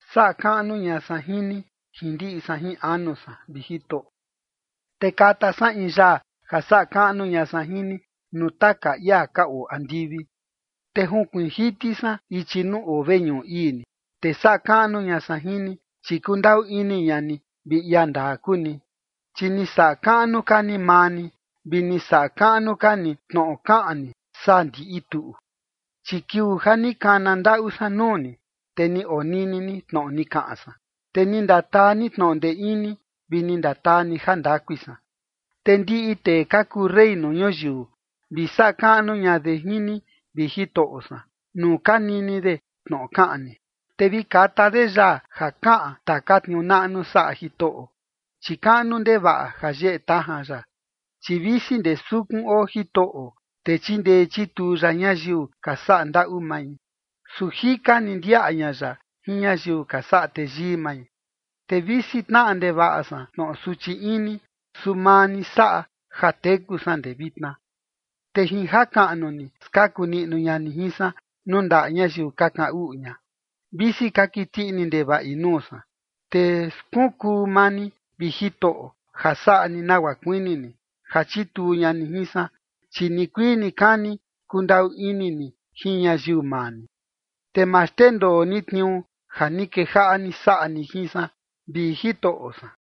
Saꞌa kaꞌnu ña san jin ni jin ndiꞌi san jin anu san, vi Jitoꞌo, te kata san in yaa ja saꞌa kaꞌnu ña san jin ni nuu taka ia ka oo andivi. Te junkuiin jiti san ichi nuu oo veñuꞌu ii ni, te saꞌa kaꞌnu ña san jin ni, chi kundaꞌu ini ña ni vi ia ndaa kuu ni, chi ni saꞌa kaꞌnu ka ni maa ni vi ni saꞌa kaꞌnu ka ni tnoꞌo kaꞌan ni saa ndiꞌi tuꞌu. Chi kiuu ja ni kana ndaꞌu san nuu ni, te ni onini ni tnoꞌo ni kaꞌan san, te ni ndataa ni tnoꞌo ndee ini vi ni ndataa ni jandakui san. Te ndiꞌi tee ka kuu rey nuu ñuyiu, vi saꞌa kaꞌnu ña de jin ni, vi Jitoꞌo san, nuu ka nini de tnoꞌo kaꞌan ni. Te vi kata de yaa ja kaꞌan taka tniuu naꞌnu saꞌa Jitoꞌo, chi kaꞌnu ndevaꞌa ja yeꞌe tajan ya. Chi visi ndee sukun oo Jitoꞌo, te chindee chituu ya ñayiu ka saꞌa ndaꞌu mai, su jika ni ndiaꞌa ña ya jin ñayiu ka saꞌa teyii mai. Te visi tnaꞌa ndevaꞌa san tnoꞌo suchi ini, su maa ni saꞌa ja teku san ndee vitna. Te jin jakaꞌnu ni, skaku niꞌnu ña ni jin san, nuu ndaꞌa ñayiu ka kaꞌan uꞌu ña, visi ka kiti ini ndevaꞌi nuu san. Te skunkuu maa ni, vi Jitoꞌo, ja saꞌa ni nagua kuini ni, ja chituu ña ni jin san. Chi nikuii nikani kundaꞌu ini ni jin ñayiu maa ni, te ma xndendoo ni tniuu ja ni kejaꞌa ni saꞌa ni jin san, vi Jitoꞌo san.